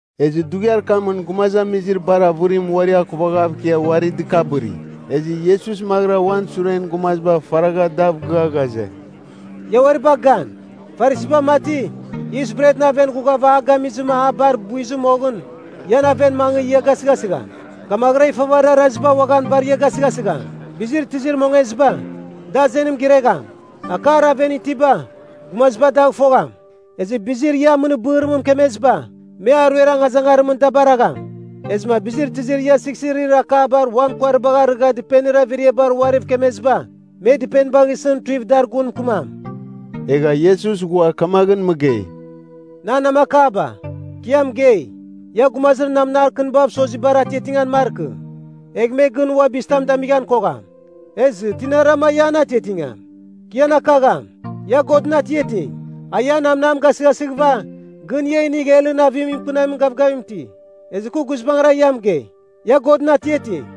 Ezɨ dughiar kamɨn gumazamizir bar avɨrim uari akuvaghav ikia uari dɨkabɨri. Ezɨ Iesus maghɨra uan suren gumaziba faragha dav gɨa ghaze, “Ia uari bagh gan. Farisiba mati, yis bretɨn aven ghughava a gamizɨma a bar buiz moghɨn ian aven mangɨ ia gasɨghasɨgham. Kamaghɨra ifavarir araziba uaghan bar ia gasɨghasigham. Bizir tizir mongeziba, da azenim giregham. Akar aven itiba, gumaziba dagh fogham. Ezɨ bizir ia amɨnir bɨrimɨn mɨkemeziba, me aruer angazangarimɨn da baragham. Ezɨma bizir tizir ia sighsirir akabar uan kuaribagh arɨgha dɨpenir averiabar uariv kemeziba, me dɨpenibagh isɨn tuiv dar gun mɨkɨmam.” Egha Iesus ghua kamaghɨn mɨgei, “Nan namakaba, kɨ ia mɨgei, ia gumazir namnar kɨnibav sozibar atiatingan markɨ. Egh me gɨn ua bizitam damighan kogham. Ezɨ, tinarama ia an atiatingam, kɨ ian akagham. Ia Godɨn atiating, a ian namnam gasɨghasighɨva, gɨn ia inigh helɨn avim mɨkɨnamin gavgavim iti. Ezɨ kɨ guizbangɨra ia mɨgei, ia Godɨn atiating.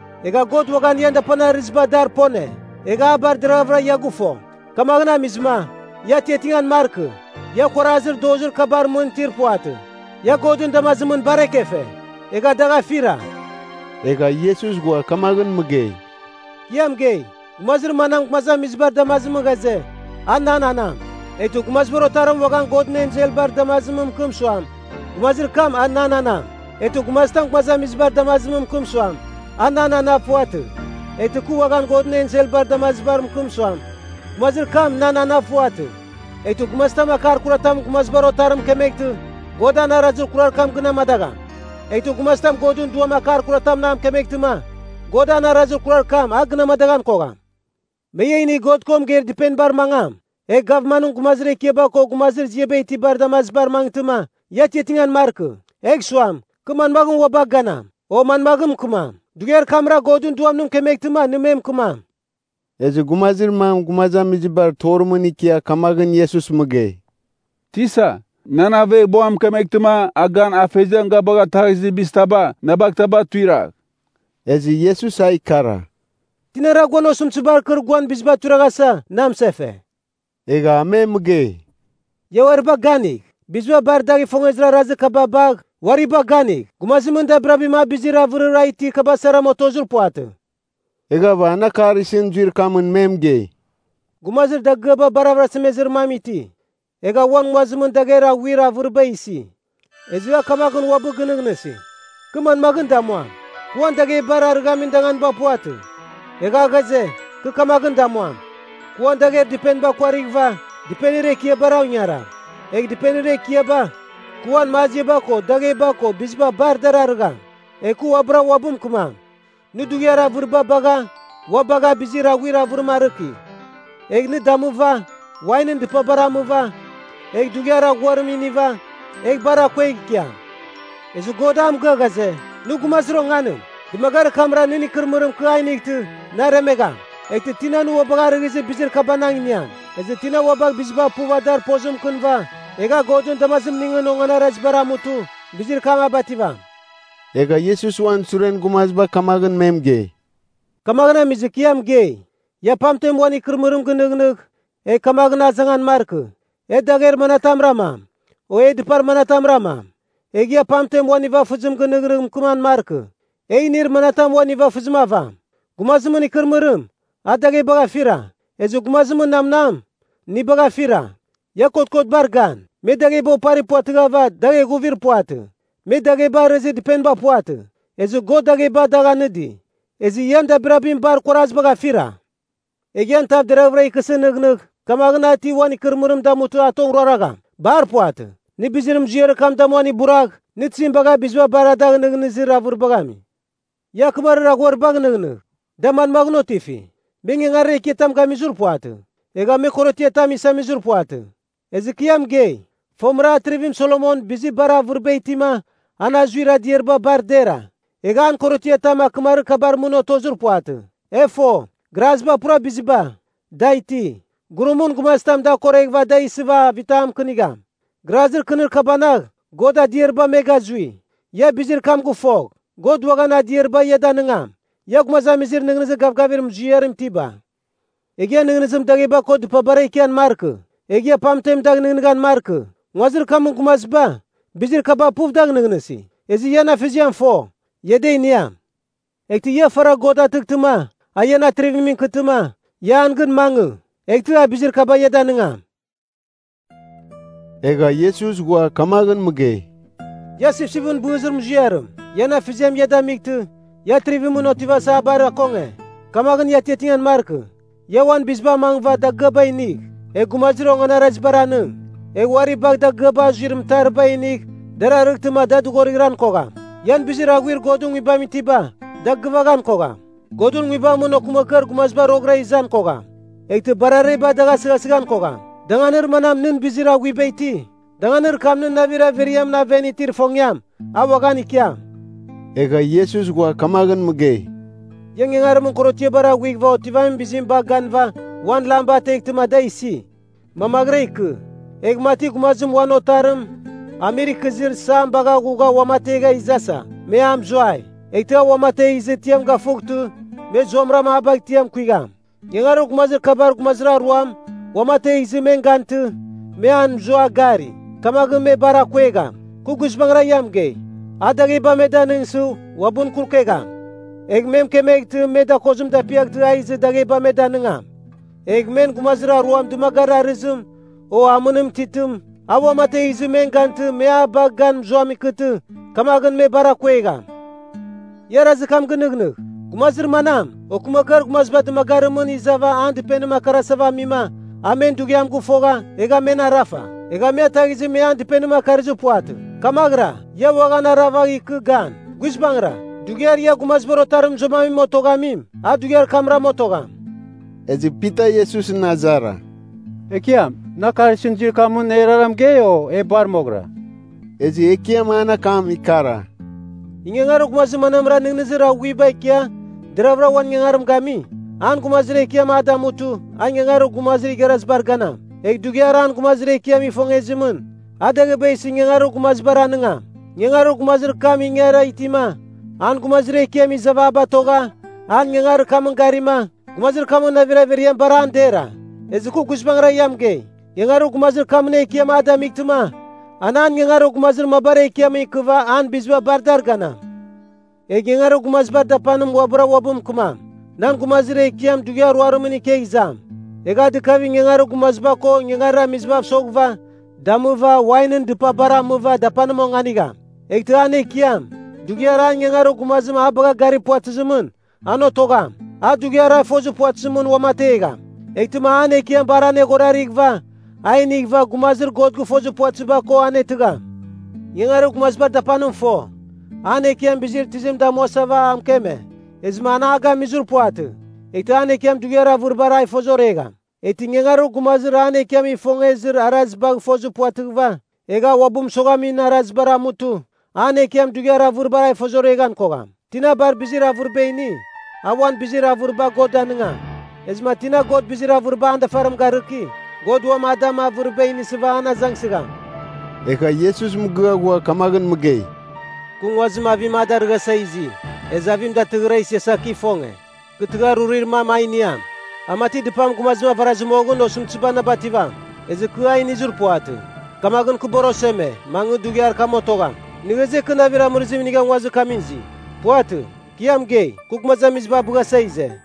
Egha God uaghan ian dapanir arɨziba dar pone, egha a bar deraghavɨra ia gɨfo. Kamaghɨn amizɨma, ia atiatingan markɨ. Ia kuarazir dozir kabar mɨn itir puvatɨ. Ia Godɨn damazimɨn bar ekefe, egha dagh afira.” Egha Iesus ghua kamaghɨn mɨgei, “Kɨ ia mɨgei, Gumazir manam gumazamizibar damazimɨn ghaze, a nan anam, eghtɨ Gumazibar Otarim uaghan Godɨn enselbar damazibar mɨkɨm suam, gumazir kam a nan anam. Eghtɨ gumazitam gumazamizibar damazimɨn mɨkɨm suam, a nan anav puvatɨ, eghtɨ kɨ uaghan Godɨn enselbar damazibar mɨkɨm suam, gumazir kam nan anav puvatɨ. Eghtɨ gumazitam akar kuratam Gumazibar Otarim mɨkemeghtɨ, God an arazir kurar kam gɨn amadagham. Eghtɨ gumazitam Godɨn Duam akar kuratam a mɨkemeghtɨma, God an arazir kurar kam, a gɨn amadaghan kogham. Me ia inigh God ko mɨgeir dɨpenibar mangam. Egh gavmanɨn gumazir ekiaba ko gumazir ziaba itibar damazibar mangɨtɨma, ia atiatingan markɨ. Egh suam, kɨ manmaghɨn ua bagh ganam, o manmaghɨn mɨkɨmam? Dughiar kamra Godɨn Duam nɨ mɨkemeghtɨma nɨ me mɨkɨmam.” Ezɨ gumazir mam gumazamizibar torimɨn ikia kamaghɨn Iesus mɨgei, “Tisa, nan aveghbuam mɨkemeghtɨma a gan afeziam ga bagha taghizir bizitaba na bagh taba tuiragh.” Ezɨ Iesus a ikara, “Tinara guan osɨmtɨzibar kɨr guan biziba tuiraghasa, na mɨsefe?” Egha a me mɨgei, “Ia uari bagh ganigh. Biziba bar dagh ifongezir arazir kaba bagh, uari bagh ganigh! Gumazimɨn dabirabim a bizir avɨrir a itir kaba saram otozir puvatɨ.” Eghava an akar isɨn zuir kamɨn me mɨgei, “Gumazir dagɨaba bar avɨrasemezir mam iti. Egha uan nguazimɨn dagher aghuir avɨriba isi. Ezɨ a kamaghɨn uabɨ gɨnɨghnɨsi, ‘Kɨ manmaghɨn damuam? Kɨ uan daghebar arɨghamin danganiba puvatɨ.’ “Egha a ghaze, ‘Kɨ kamaghɨn damuam. Kɨ uan dagher dɨpeniba kuarighɨva, dɨpenir ekiabara ingarigham. Egh dɨpenir ekiaba, kɨ uan maziaba ko dagheba ko biziba bar dar arɨgham. Egh kɨ uabɨra uabɨ mɨkɨmam, “Nɨ dughiar avɨriba bagha ua bagha bizir aghuir avɨrim arɨki. Egh nɨ damɨva, wainɨn dɨpabar amɨva, egh dughiar aghuarim iniva, egh bar akuegh ikiam.” ’ “Ezɨ God a mɨgɨa ghaze, ‘Nɨ gumazir onganim. Dɨmagarir kamra nɨn ikɨrɨmɨrim kɨ a inightɨ, naremegham. Eghtɨ tina nɨ ua bagh arɨghizir bizir kabanagh iniam?’ “Ezɨ tina ua bagh biziba puv dar pozim mɨkɨnɨva, egh a Godɨn damazimningɨn onganarazibar amutɨ, bizir kam a bativam.” Egha Iesus uan suren gumaziba kamaghɨn me mɨgei, “Kamaghɨn amizɨ, kɨ ia mɨgei, ia pamten uan ikɨrɨmɨrim gɨnɨghnɨgh, egh kamaghɨn azangan markɨ, e dagher manatam ramam, o e dɨpar manatam ramam? Egh ia pamten uan nivafɨzibagh nɨghnɨgh mɨkɨman markɨ, e inir manatam uan nivafɨzim avam? Gumazimɨn ikɨrɨmɨrim, a daghebagh afira, ezɨ gumazimɨn namnam inibagh afira. Ia kotkotbar gan. Me dagheba opari puvatɨghava dagh eghuvir puvatɨ, me dagheba arɨzir dɨpeniba puvatɨ. Ezɨ God dagheba dagh anɨdi! Ezɨ ian dabirabim bar kuarazibagh afira. Egh ian tav deraghvɨra ikɨsɨ nɨghnɨgh kamaghɨn a ti uan ikɨrɨmɨrim damutɨ a tong ruaragham? Bar puvatɨ. Nɨ bizir muziarir kam damuan iburagh, nɨ tizim bagha biziba bar a dagh nɨghnɨzir avɨribagh ami? “Ia akɨmarir aghuaribagh nɨghnɨgh. Da manmaghɨn otifi? Me ingangarir ekiatam gamir puvatɨ. Egha me korotiatam isamizir puvatɨ. Ezɨ kɨ ia mɨgei, fomɨra Atrivim Solomon bizir bar avɨriba itima an azuir adiariba bar dera, egha an korotiatam akɨmarir kabar mɨn otozir puvatɨ. E fo, graziba pura biziba, da iti, gurumɨn gumazitam da akoreghɨva da isɨva avitam mɨkɨnigham. Grazir kɨnir kabanagh God adiariba me gazui. Ia bizir kam gɨfogh, God uaghan adiariba ia danɨngam. Ia gumazamizir nɨghnɨzir gavgavir muziarim itiba! Egh ian nɨghnɨzim dagheba ko dɨpabara ikian markɨ. Egh ia pamtem dagh nɨghnɨghan markɨ. Nguazir kamɨn gumaziba bizir kaba puv dagh nɨghnɨsi. Ezɨ ian Afeziam fo, ia da iniam. Eghtɨ ia faragh God atɨghtɨma, a ian Atrivimɨn ikɨtɨma, ia an gɨn mangɨ. Eghtɨ, a bizir kaba ia danɨngam.” Egha Iesus ghua kamaghɨn mɨgei, “Ia sipsipɨn bɨzir muziarim, ian Afeziam ia damightɨ, ia Atrivimɨn otivasa a bar akonge. Kamaghɨn ia atiatingan markɨ. Ia uan biziba amangɨva dagɨaba inigh, egh gumazir onganarazibar anɨng. Egh uari bagh dagɨaba azuir mɨtariba inigh dar arightɨma da dɨghorighɨran kogham. Ian bizir aghuir Godɨn Nguibamɨn itiba, da gɨvaghan kogham. Godɨn nguibamɨn okɨmakɨar gumaziba roghɨra izan kogham, eghtɨ barareba dagh asɨghasɨghan kogham. Danganir manam nɨn bizir aghuiba iti, danganir kam nɨn navir averiamɨn aven itir ifongiam, a uaghan ikiam.” Egha Iesus ghua kamaghɨn mɨgei, “Ia ingaramin korotiabar aghuighɨva otivamin bizim bagh ganɨva uan lamba ateghtɨma da isi, mamaghɨra ikɨ. Egh mati gumazim uan otarim amir ikɨzir isam bagha ghugha uamategh izasa, me a mɨzuai. Eghtɨ a uamategh izɨ tiam gafughtɨ me zuamɨram a bagh tiam kuigham. Ingarir gumazir kabar gumazir aruam uamategh izɨ men gantɨ, me a mɨzua gari. Kamaghɨn me bar akuegham. Kɨ guizbangɨra ia mɨgei, a dagheba, me danɨngsɨ, uabɨn kurukegham. Egh me mɨkemeghtɨ, me dakozim dapiaghtɨ a izɨ dagheba me danɨngam. Egh men gumazir aruam dɨmagarir arɨzim, o amɨnim titɨm a uamategh izɨ men gantɨ me a bagh gan mɨzuam ikɨtɨ, kamaghɨn me bar akuegham. Ia arazir kam gɨnɨghnɨgh. Gumazir manam, okɨmakɨar gumaziba dɨmagarimɨn izava an dɨpenim akarasava amima, a men dughiam gɨfogha, egha men arafa. Egha me ataghizɨ me an dɨpenim akarizir puvatɨ. Kamaghɨra, ia uaghan aravagh ikɨ gan. Guizbangɨra, dughiar ia Gumazibar Otarim mɨzuaman koghamim, a dughiar kamram otogham.” Ezɨ Pita Iesusɨn azara, “Ekiam, nɨ akar isɨn zuir kamɨn erara mɨgei, o e bar moghɨra?” Ezɨ Ekiam an akam ikara, “Ingangarir gumazir manamra nɨghnɨzir aghuiba ikia deravɨra uan ingangarim gami? An gumazir ekiam a damutɨ, a ingangarir gumazir igharazibar ganam. Egh dughiar an gumazir ekiam ifongezimɨn, a dagheba isɨ ingangarir gumazibar anɨngam. Ingangarir gumazir kam ingara itima, an gumazir ekiam izava a batogha an ingangarir kamɨn garima, gumazir kamɨn navir averiam bar an dera. Ezɨ kɨ guizbangɨra ia mɨgei, ingangarir gumazir kamɨn ekiam a damightɨma, an an ingangarir gumazir mabar ekiamɨn ikɨva an biziba bar dar ganam. Egh ingangarir gumazibar dapanim uabɨra uabɨ mɨkɨmam, ‘Nan gumazir ekiam dughiar ruarimɨn ikegh izam.’ Egh a dɨkavigh ingangarir gumaziba ko ingangarir amizibav soghɨva, damɨva, wainɨn dɨpabar amɨva dapanim onganigham. Eghtɨ an ekiam, dughiar an ingangarir gumazim a bagha garir puvatɨzimɨn, an otogham. A dughiar a fozir puvatɨzimɨn uamategham. Eghtɨma an ekiam bar anerghorarighɨva a inighɨva gumazir God gɨfozir puvatɨziba ko anetɨgham. “Ingangarir gumazibar dapanim fo, an ekiam bizir tizim damuasava a mɨkeme, ezɨma an a gamizir puvatɨ. Eghtɨ an ekiam dughiar avɨribar a ifozoregham. Eghtɨ ingangarir gumazim an ekiam ifongezir arazibagh fozir puvatɨghɨva, egh a uabɨ mɨsoghamin arazibar amutɨ, an ekiam dughiar avɨribar a ifozoreghan kogham. Tina bar bizir avɨriba ini, a ua bizir avɨriba God danɨngam. Ezɨma tina God bizir avɨriba an dafarim garɨki, God uam a dam avɨriba inisɨva an azangsɨgham.” Egha Iesus mɨgɨa ghua kamaghɨn mɨgei, “Kɨ nguazim avim a darɨghasa izi. Ezɨ avim datɨrɨghɨra isiasa kɨ ifonge. Kɨ tɨghar rurir mam a iniam. A mati dɨpam gumazim avarazɨ moghɨn, osɨmtɨziba na bativam. Ezɨ kɨ a inizir puvatɨ. Kamaghɨn kɨ bar oseme, mangɨ dughiar kam otogham! Nɨ ghaze, kɨ navir amɨrɨzim inigha nguazir kamɨn izi? puvatɨ, kɨ ia mɨgei, kɨ gumazamiziba abɨghasa ize.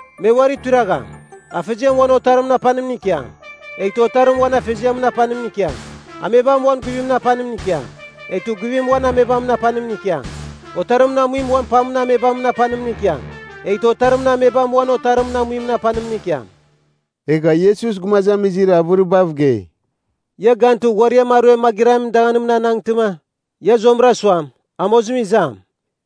Me uari tuiragham, afeziam uan otarimɨn apanimɨn ikiam, eghtɨ otarim uan afeziamɨn apanimɨn ikiam. Amebam uan guivimɨn apanimɨn ikiam, eghtɨ guivim uan amebamɨn apanimɨn ikiam. Otarimɨn amuim uan pamɨn amebamɨn apanimɨn ikiam, eghtɨ, otarimɨn amebam uan otarimɨn amuimɨn apanimɨn ikiam.” Egha Iesus gumazamizir avɨribav gei, “Ia gantɨ, ghuariam aruem magɨramin amadagham anangtɨma, ia zuamɨra suam, ‘Amozim izam,’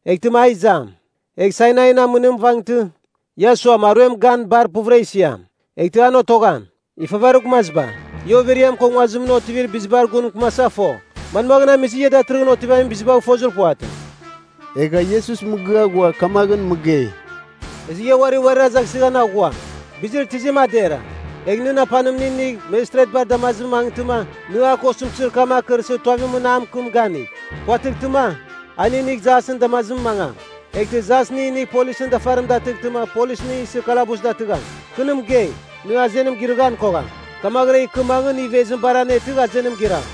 eghtɨma a izam. Egh Sainain amɨnim vangtɨ, ia suam, aruem gan bar puvɨra isiam. Eghtɨ an otogham. Ifavarir gumaziba! Ia overiam ko nguazimɨn otivamin bizibar gun mɨkɨmasa fo. Manmaghɨn amizɨ, ia datɨrɨghɨn otivamin bizibagh fozir puvatɨ?” Egha Iesus mɨgɨa ghua kamaghɨn mɨgei, “Ezɨ ia uari uarir azangsɨghan aghua, bizir tizim a dera. Egh nɨn apanim nɨ inigh mejistretbar damazimɨn mangɨtɨma, nɨ a ko osɨmtɨzir kam akɨrsɨ tuavimɨn a mɨkɨm ganigh. Puvatɨghtɨma, a nɨ inigh jasɨn damazimɨn mangam. Eghtɨ jas nɨ inigh polisɨn dafarim datɨghtɨma polis nɨ isɨ kalabuziam datɨgham. Kɨ nɨ mɨgei, nɨ azenim girɨghan kogham, kamaghɨra ikɨ mangɨ nɨ ivezim bar anetɨgh azenim giram.”